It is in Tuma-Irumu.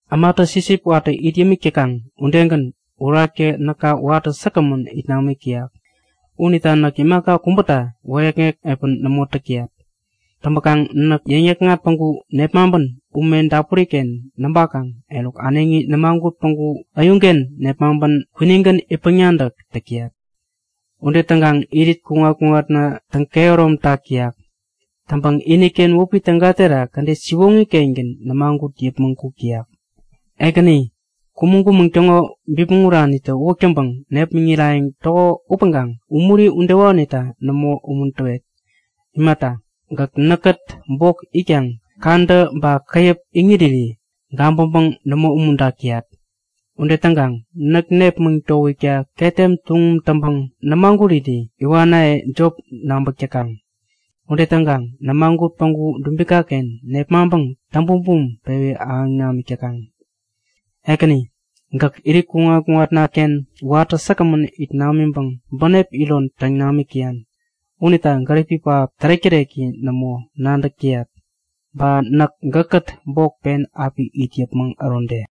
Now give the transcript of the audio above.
Ämatä sipsip watä it yämik täkaŋ udegän, Uraktä näka watä säkgämän it namik täyak. Unita näk imaka kubäta wäyäkŋek piä nämo täk täyat. Täŋpäkaŋ näk yäŋnäkŋat päŋku nepmaŋpän ume dapuriken näŋpakaŋ eruk äneŋi nämagut päŋku äyuŋken nepmaŋpän kwinigän itpäŋ-nadäk täk täyat. Ude täŋkaŋ irit kuŋat-kuŋatna täŋ-kehäromtak täyak. Täŋpäŋ iniken wäpi täga terak kädet siwoŋi-kengän nämagut yäpmäŋ kuk täyak. Ekäni, kumäŋ-kumäŋ täŋo bipmäŋ uranitä uwäk täŋpäŋ nepmäŋirayäŋ täko upäŋkaŋ umuri udewanita nämo umuntäwet. Imata, gäk näkkät bok itkaŋ kadä ba käyäp iŋiriri gabäŋpäŋ nämo umuntak täyat. Ude täŋkaŋ näk nepmäŋ towikta ketem tuŋum täŋpäŋ nämaguriri iwanaye jop nabäk täkaŋ. Ude täŋkaŋ nämagut päŋku dubikaken nepmaŋpäŋ täŋ-bumbum pewi ahäŋ namik täkaŋ. Ekäni, gäk irit kuŋat-kuŋatnaken watä säkgämän it namiŋpäŋ bänep iron täŋ namik täyan. Unita gäripi pähap tärek-täreki nämo, nadäk täyat. Ba näk gäkkät bok pen api it yäpmäŋ ärode.